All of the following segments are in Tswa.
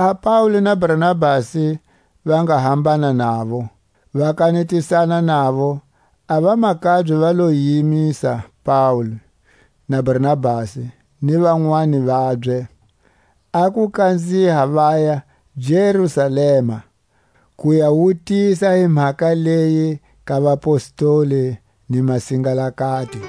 Laha Paule na Barnabasi va nga hambana navo, va kanetisana navo, a vamakabye va lo yimisa Paule na Barnabasi, ni vanwani vabye, a ku kanziha vaya Jerusalema, ku ya wutisa hi mhaka leyi ka vapostoli ni masingalakati.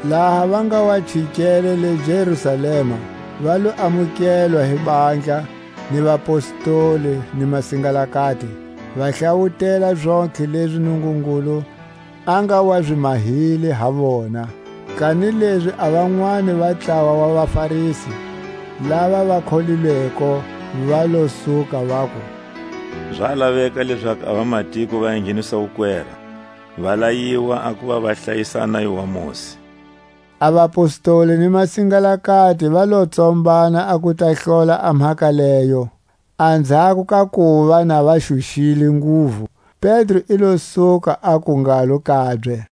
Laha va nga wa chikele le Jerusalema, va lo amukelwa hi handla ni vapostoli ni masingalakati, va hlawutela zontlhe lezi Nungungulu a nga wa zi mahile ha vona. Kanilezi a vanwani va ntlawa wa vaFarisi, lava va kholilweko, va lo suka, vaku: Za laveka lezaku a vamatiko va engheniswa wukwera, va layiwa a kuva va hlayisa a nayo wa Mosi. A vapostoli ni masingalakati va lo tsombana a ku ta hlola a mhaka leyo. Anzhako ka kuva na va xuxile nguvu, Pedro i lo suka, aku ngalo kabye: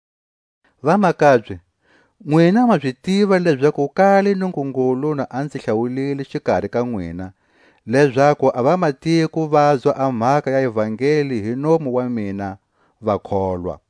Vamakabye, nwina ma zi tiva lezaku kale Nungungulu na a nzi hlawulile xikari ka nwina, lezaku a vamatiko vazwa a mhaka ya ivangeli hi nomu wa mina, va kholwa.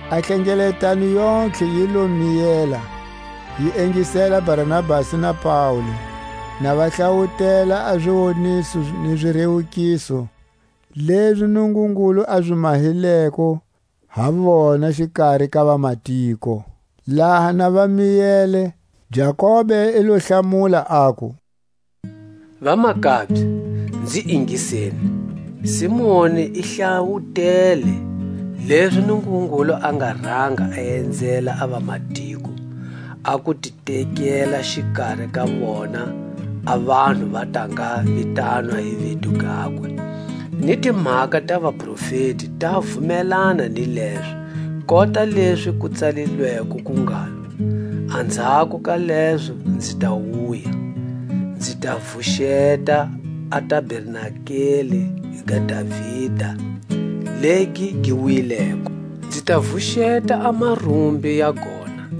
A hlengeletano yontlhe yi lo miyela; yi ingisela Barnabasi na Paule na va hlawutela a ziwoniso ni zirewukiso lezi Nungungulu a zi mahileko ha vona xikari ka vamatiko. Laha na va miyele, Jakobe i lo hlamula, aku: Vamakabye, nzi ingiseni: Simoni i hlawutele lezi Nungungulu a nga ranga a enzela a vamatiko, a ku ti tekela xikari ka vona a vanhu va ta nga vitanwa hi vito gakwe. Ni timhaka ta vaprofeti ta vumelana ni lezo, kota lezi ku tsalilweko ku ngalo: Anzhako ka lezo nzi ta wuya, Nzi ta vuxeta a tabernakele ga Davida legi gi wileko; Nzi ta vuxeta a marumbi ya gona,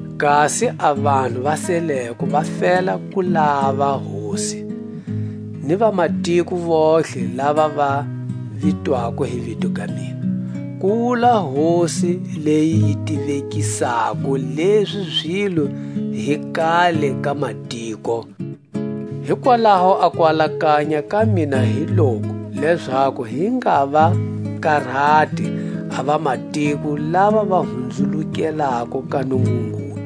Kasi a vanhu va seleko va fela ku lava Hosi, Ni vamatiko vontlhe lava va vitwako hi vito ga mina, Ku wula Hosi, leyi yi tivekisako lezi zilo hi kale ka matiko. Hikwalaho a kualakanya ka mina hi loku, lezaku hi nga va karati a vamatiko lava va huhulukelako ka Nungungulu;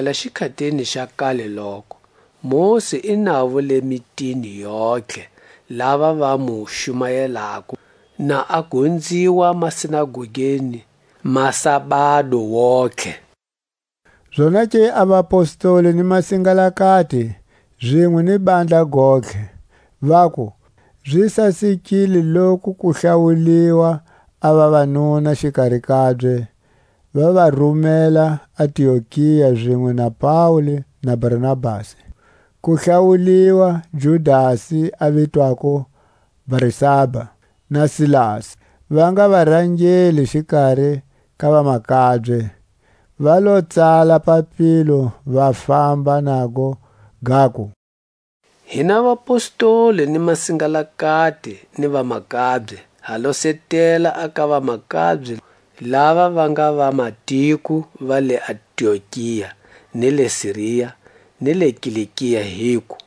Hakuva kusukela xikhatini xa kaleloko, Mosi i navo le mitini yontlhe, lava va mu xumayelako, na a gonziwa masinagogeni masabado wontihe. Zonake a vapostoli ni masingalakati, zinwe ni handla gontlhe, vaku, zi sasekile loku ku hlawuliwa a vavanuna xikari kabye, va va rumela Antiokia zinwe na Paule na Barnabasi; ku hlawuliwa Judasi a vitwako Barsaba, na Silasi, va nga varangeli xikari ka vamakabye. Va lo tsala papilo, va famba nago, gaku: Hina vapostoli ni masingalakati ni vamakabye, ha losetela a ka vamakabye lava va nga vamatiko va le Antiokia, ni le Siria, ni le Kilikia, hiku: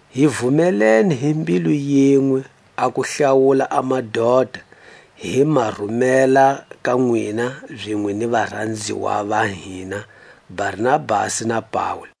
hi vumelene hi mbilu yinwe a ku hlawula a madota, hi ma rumela ka nwina zinwe ni varanziwa va hina Barnabasi na Paule,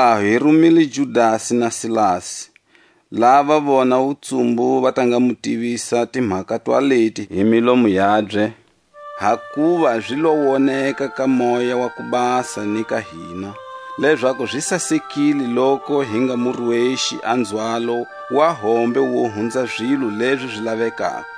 Hikwalaho hi rumile Judasi na Silasi, lava vona wutsumbu va ta nga mu tivisa timhaka twaleti hi milomu yabye. Hakuva zi lo woneka ka Moya wa ku Basa ni ka hina, lezaku zi sasekile loku hi nga mu rwexi a nzhwalo wa hombe wo hunza zilo lezi zi lavekako;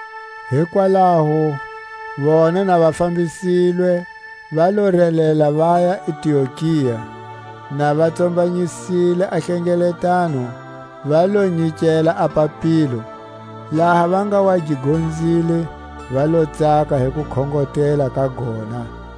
Hikwalaho vona na va fambisilwe, va lo relela vaya Antiokia; na va tsombanyisile a hlengeletano va lo nyikela a papilo. Laha va nga wa gi gonzile va lo tsaka hi kukhongotela ka gona.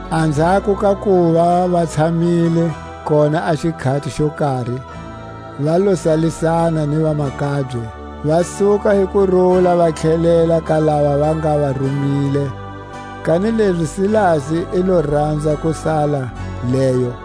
Anzhako ka kuva va tshamile kona a xikhati xo kari, va lo salisana ni vamakabye, va suka hi kurula va tlhelela ka lava va nga va rumile. Kanilezi Silasi i lo ranza ku sala leyo.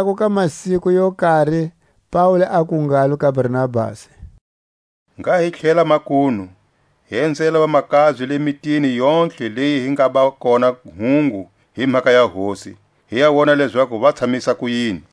Anzhako ka masiku yo kari, Paule aku ngalo ka Barnabasi: Ngha hi tlhela makunu, hi enzela vamakabye le mitini yontlhe leyi hi ngaba kona hungu hi mhaka ya Hosi, hi ya wona lezaku va tshamisa kuyini.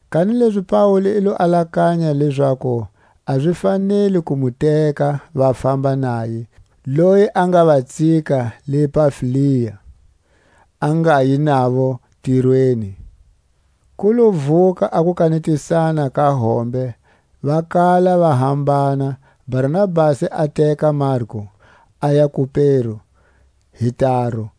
kanilezi Paule i lo alakanya lezaku a zi faneli ku mu teka va famba naye, loyi a nga va tsika le Pamfilia, a ngayi navo ntirweni. Ku lo vuka a kukanetisana ka hombe va kala va hambana. Barnabasi a teka Marku, aya Kupero hi taru;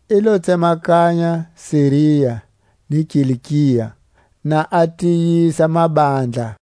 I lo tsemakanya Siria ni Kilikia, na a tiyisa mabandla.